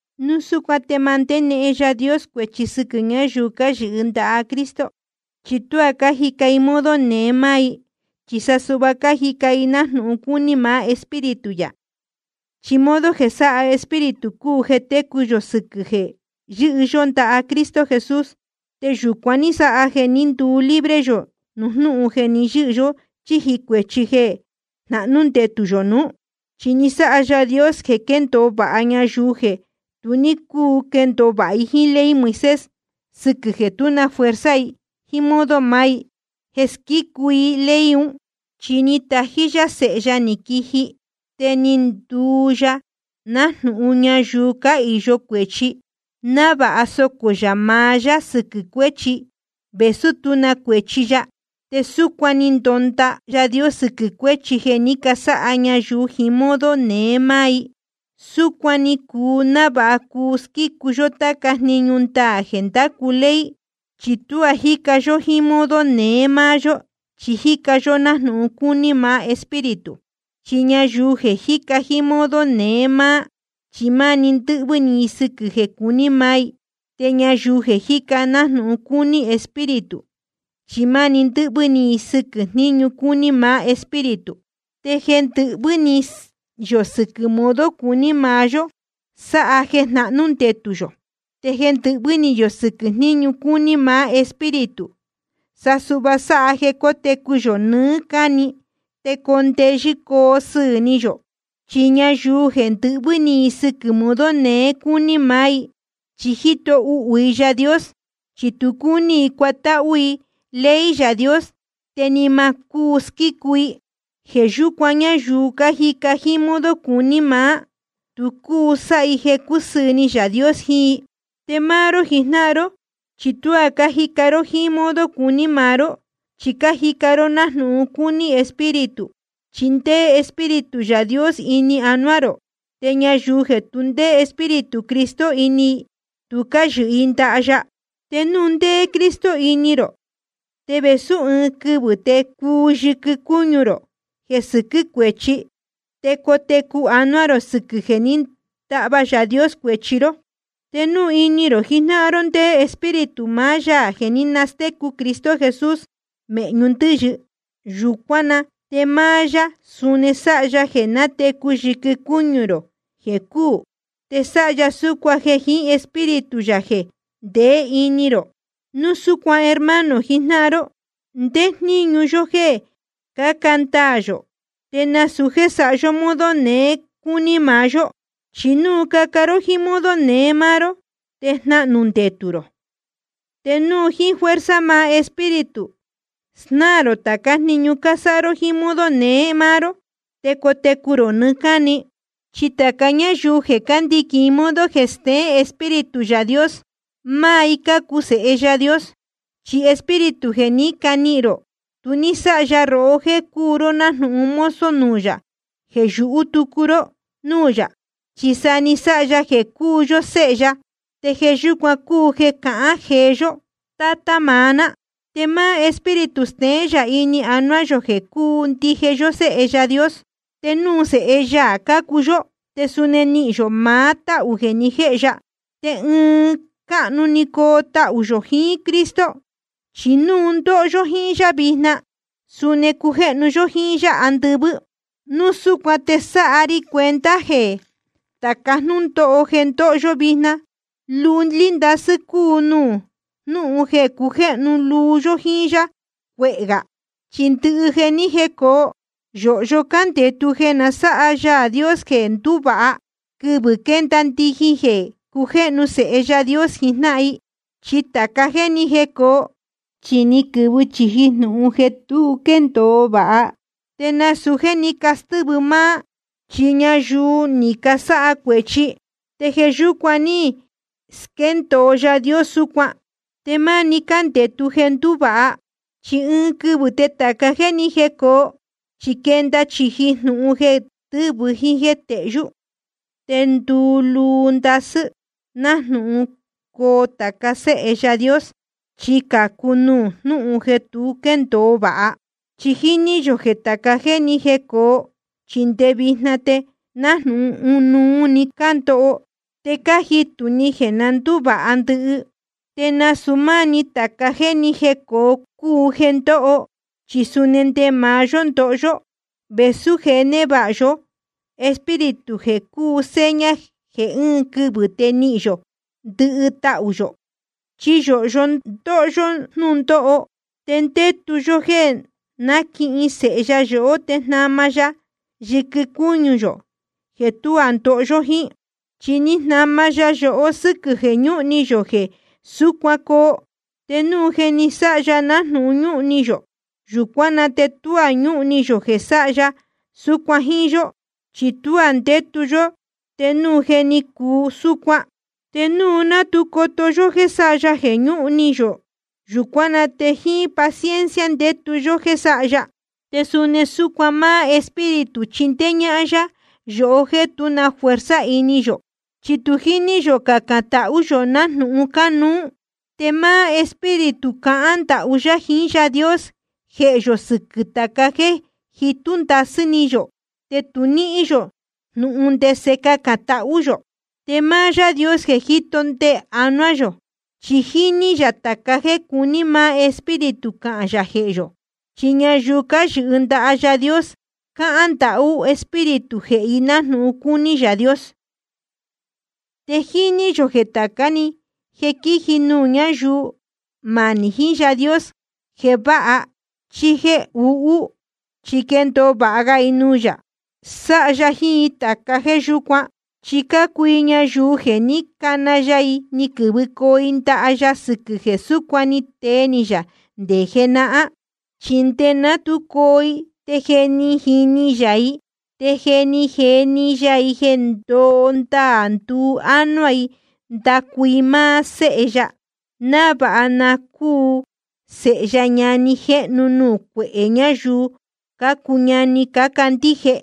Núu súcuan te ma ndénehen Yaā Dios cuēchi sɨquɨ̄ ñayuu cáyɨhɨ ndaha Cristo. Chi tuá cájica i jíín modo neé máá i, chi sa suhva cájica i nájnūhun cúní maá Espíritu yā. Chi modo jeē sáha Espíritu cúu jeē técu yō sɨquɨ̄ jeē yɨ́hɨ yó ndaha Cristo Jesús. Te yūcuan ní sáha jeē ní nduu libre yō nuū jnúhun jeē ni yɨ́hɨ yó chíji cuēchi jeē jnahnú ndetū yō nuú. Chi ni sáha Yaā Dios jeē quéndōo vāha ñayuu jeē tu ní cúu quendōo vāha jíín ley Moisés, sɨquɨ̄ jeē tú na fuerza i jíín modo maá i jeē squícu i ley un. Chi ni tají yá Sēhe ya ni quiji, te ni nduu ya nájnūhun ñayuu cáhīyo cuēchi, návāha socō yā maá yá sɨquɨ̄ cuéchi, vēsú tú na cuēchi ya. Te súcuan ni ndonda Yaā Dios sɨquɨ̄ cuéchi jeē ní casáha ñayuu jiín modo neé máá i. Súcuan ni cuu návāha cuu squícu yó táca jniñu ndaā jeē ndácu ley, chi tuá jíca yó jíín modo neé máá yó, chi jíca yó nájnūhun cúní maá Espíritu. Chi ñayuu jeē cájica jíín modo neé máá, chi máni ndɨ́hvɨ́ ni i sɨquɨ̄ jeē cuní maá i. Te ñayuu jeē cájica nájnūhun cúní Espíritu, chi máni ndɨ́hvɨ́ ni i sɨquɨ̄ jniñu cúní maá Espíritu. Te jeē ndɨhvɨ́ ni yō sɨquɨ̄ modo cuní maá yó sáha jeē jnahnú ndetū yō. Te jeē ndɨhvɨ́ ni yō sɨquɨ̄ jniñu cúní maá Espíritu, sa suhva sáha jeē cotecu yō nɨɨ́ cáni te coo ndeyɨ́ coo sɨɨ̄ ni yō. Chi ñayuu jeē ndɨhvɨ́ ni sɨquɨ̄ modo neé cúní maá i, chi jíto uhū i Yaā Dios, chi tu cúní i cuatáhú i ley Yaā Dios, te ni ma cúu squícu i. Jeē yúcuan, ñayuu jíca jíín modo cuní maá, tu cúu sáha i jeē cúsɨɨ̄ ni Yaā Dios jiín i. Te máá ró jijnáhan ró, chi tuá cájica ró jíín modo cuní maá ró, chi cájica ró nájnūhun cúní Espíritu, chi ndéé Espíritu Yaā Dios ini anuá rō. Te ñayuu jeē tu ndéé Espíritu Cristo ini i, tu cáyɨhɨ i ndaha ya. Te núu ndéé Cristo ini rō, te vēsú ɨɨn quɨvɨ̄ te cuu yɨquɨ cúñu rō jeē sɨquɨ́ cuēchi, te cotecu anuá rō sɨquɨ̄ jeē ní ndahva Yaā Dios cuēchi ró. Te núu ini rō jijnáhan ró ndéé Espíritu maá Yaā jeē ní nastécu Cristo Jesús mēhñu ndɨ́yɨ, yūcuán na te máá yá suni sáha ya jeē natecu yɨquɨ cúñu rō jeē cúū. Te sáha ya súcuan jeē jiín máá Espíritu yā jeē ndeé ini rō. Núu súcuan, hermano jijnáhan ró, ndéé jníñu yó jéē caca ndaā yō, te nasūu jéē sáha yó modo neé cúní maá yó. Chi núu caca ró jíín modo neé máá ró, te jnahnū ndetū rō. Te núu jíín fuerza maá Espíritu snáā rō tācá jniñu cásáha ró jíín modo neé máá ró, te cotecu rō nɨɨ́ cáni. Chi tāca ñáyuu jeē cándiquīn modo jeē steén Espíritu Yaā Dios, máá i cácuu sēhe Yaā Dios. Chi Espíritu jeē ní canihīn rō, tu ní sáha ya rohó jéē cuu ró nájnūhun mozo nuū yā jeē yūhú tucu ró núū yā, chi sa ni sáha ya jeē cúu yó séhe ya. Te jeē yúcuan cúu jeē cahán jee yó: Tátá maá ná. Te máá Espíritu steén yā ini anuá yō jeē cúu ndije yó séhe Yaā Dios. Te núu sēhe ya cácuu yó, te suni nihīn yō maá táhū jeē ni jéjnūhun ya, te ɨɨn cáhnu‑ni coo tahū yō jiín Cristo. Chi núu ndóho yó jíín yá vijna, suni cujéhnu yó jíín yá andɨvɨ́. Núu súcuan te sáha ri cuenta jeē tāca jnúndóho jeē ndóho yó vijna, lúlí ndasɨ́ cúu nuū jnúhun jeē cujéhnu luu yó jíín yá cucuéé gá. Chi ndɨhɨ jeē ni jécōo, yōhyo cándētu jeē na sáha Yaā Dios jeē nduvāha, quɨvɨ̄ quénda ndijin jeē cujéhnu sēhe Yaā Dios jijnáhan i. Chi tāca jéē ni jécōo, chi ni quɨ̄vɨ chīji jnūhun jeē tu quéndōo vāha. Te nasūu jéē ní castɨ́vɨ máá, chi ñayuu ni casáha cuēchi, te jeē yúcuan ní squéndōo Yaā Dios súcuan. Te máni cándētu jeē ndúvāha. Chi ɨɨn quɨvɨ̄ te tāca jéē ni jécōo, chi quenda chīji jnūhun jeē tɨ́vɨ jíín jéē tehyú. Te nduluu ndasɨ́ nájnūhun coo tāca séhe Yaā Dios, chi cācu nuū jnúhun jeē tu quéndōo vāha. Chi jíní yō jeē tāca jéē ni jécōo, chi nde vijna te nájnūhun ɨnuú‑ni cándoho te cájitū ni jeē na ndúvāha ndɨhɨ. Te nasūu máá‑ni tāca jéē ni jécōo cúu jeē ndóho, chi suni nde maá yó ndóho yó, vēsú je névāha yó Espíritu jeē cúu seña jeē ɨɨn quɨvɨ̄ te nihīn yō ndɨhɨ tahū yō. Chi yōhyo ndóho yó jnúndóho, te ndétu yó jéē náquihin séhe ya yohó te jnama ya yɨquɨ cúñu yō jeē tuá ndoho yó jíín. Chi ni jnama ya yohó sɨ́quɨ̄ jeē ñúhun ni yō jeē súcuan coo. Te núu je ni sáha ya nájnūhun ñúhun ni yō, yūcuán na te tuá ñúhun ni yō jeē sáha ya súcuan jíín yó. Chi tuá ndétu yó te núu je ni cuu súcuan. Te núu ná tu coto yó jéē sáha ya jeē ñúhun ni yō, yūcuán na te jíín paciencia ndétu yó jéē sáha ya. Te suni súcuan máá Espíritu chíndéé ñáhán yá yohó jéē tú na fuerza ini yō. Chi tu jíní yō cacān tahú yō nájnūhun cánuú. Te máá Espíritu cahán ndahú yá jiín Yaā Dios jehē yō sɨquɨ̄ tāca jéē jitú ndasɨ́ ni yō te tu níhín yō jnūhun ndese cacān tahú yō. Te máá Yaā Dios jeē jíto ndee anuá yō, chi jíní yā tāca jéē cuní maá Espíritu cahān yā jehē yō. Chi ñayuu cáyɨhɨ ndaha Yaā Dios, cáhán ndahú Espíritu jehē i nájnūhun cúní Yaā Dios. Te jíní yō jeē tācá‑ni jeē quíji nuū ñáyuu manī jiín Yaā Dios, jeē váha chí jéē uhú, chi quéndōo vāha ga i nuū yā, sáha ya jiín táca jéē yúcuan. Chi cácuu i ñayuu jeē ní cana ya i ni quɨ̄vɨcoo i ndaha ya sɨquɨ̄ jeē súcuan ni tee ni yā nde jenahán. Chi nde ná tu coo i te je jíní yā i, te je ni jeni ya i jeē ndoo ndaā nduu ánuá i ndacu i máá Séhe ya, návāha na cúu Sēhe ya ñani jéhnu nuū cuehē ñayuu cácuu ñani cácandíje.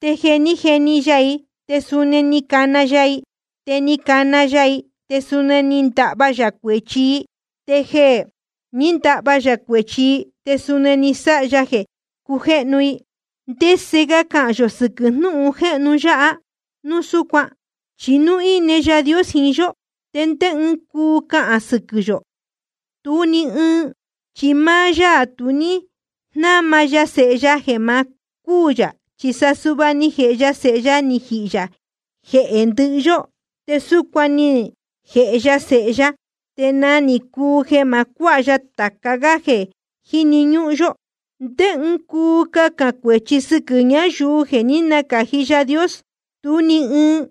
Te jeē ní jeni ya i, te suni ni cana ya i. Te jeē ní cana ya i, te suni ni ndahva yā cuēchi i. Te jeē ní ndahva yā cuēchi i, te suni ni sáha ya jeē cujéhnu i. ¿Te ndese ga cahān yō sɨquɨ̄ jnúhun jéhnu yáha núu súcuan? Chi núu íne Yaā Dios jiín yó, ¿te ndé ɨɨn cuu cahān sɨquɨ̄ yō? Tú ni ɨɨn. Chi máá yá tu ní jnáma ya Sēhe ya jeē ma cúū yā, chi sa suhva ni jēhe ya Sēhe ya ni jihī yā jehē ndɨhɨ yó. Te núu súcuan ni jēhe ya Sēhe ya, te nagā ni cuu jeē ma cuáha ya tāca gá jeē jíni ñúhún yó. ¿Te ndé ɨɨn cuu cahān cuēchi sɨquɨ̄ ñayuu jeē ní nacāji Yaā Dios? Tú ni ɨɨn.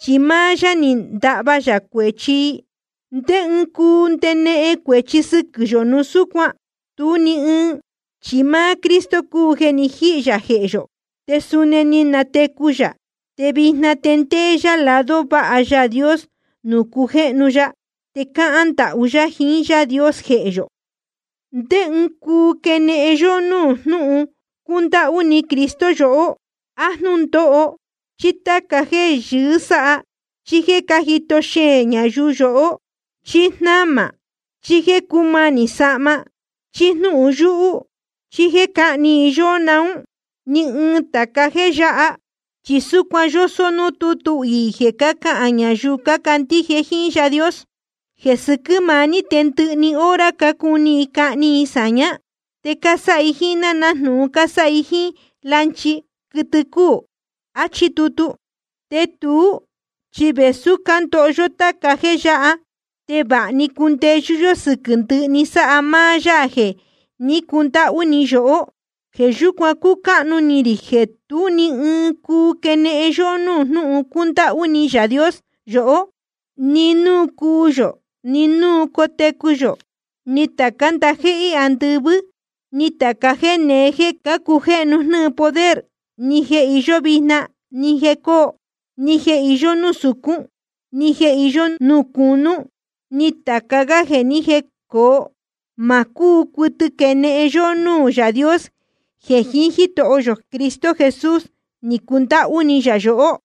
Chi máá yá ni ndahva yā cuēchi i. ¿Te ndé ɨɨn cuu ndenehen cuēchi sɨquɨ̄ yō núu súcuan? Tú ni ɨɨn. Chi máá Cristo cúu jeē ni jíhī yā jehē yō, te suni ni natecu yā. Te vijna te ndéé yá lado váha Yaā Dios nuū cujéhnu ya, te cáhán ndahú yá jiín Yaā Dios jehē yō. ¿Te ndé ɨɨn cuu quenehen yóhó núū jnúhun cúndáhú ni Cristo yohó? ¿A jnúndóho, chí táca jéē yɨɨ́ sáha, chí jéē cájito xeēn ñayuu yohó, chí jnámā, chí jéē cúmanī sahma, chí jnúhun yúhú, chí jéē cáhni i yóhó naún? Ni ɨɨn tāca jéē yáha. Chi súcuan yósó núū tútu iī jeē cácahān ñayuu cácandíje jíín Yaā Dios: Jeē sɨquɨ́ maá ní te ndɨhɨ‑ni hora cácuni i cahni i sāñá. Te cásáha i jíín ná nájnūhun cásáha i jíín lanchi, quɨtɨ cúū. Achí tutu. Te tuú chi vēsú cándoho yó táca jéē yáha, te vāha‑ni cúndeyɨ́ yó sɨquɨ̄ ndɨhɨ‑ni, sáha máá Yaā jeē ní cundáhú ni yohó. Jeē yúcuan cúcáhnu ni rī jeē tú ni ɨɨn cuu quenehen yóhó núū jnúhun cúndáhú ni Yaā Dios yohó. Ni núu cuu yō, ni núu cotecu yō, ni tācá ndajéhé andɨvɨ́, ni tāca jéē neé jéē cácujéhnu jnɨ́ɨ poder, ni jeē iyó vijna, ni jeē cóo, ni jeē iyó núū sūcún, ni jeē iyó núū cūnú, ni tāca gá jeē ní jecōo, ma cúu cuɨtɨ quenehen yóhó núū Yaā Dios, jeē jiín Jítoho yō Cristo Jesús ni cundáhú ni yā yohó.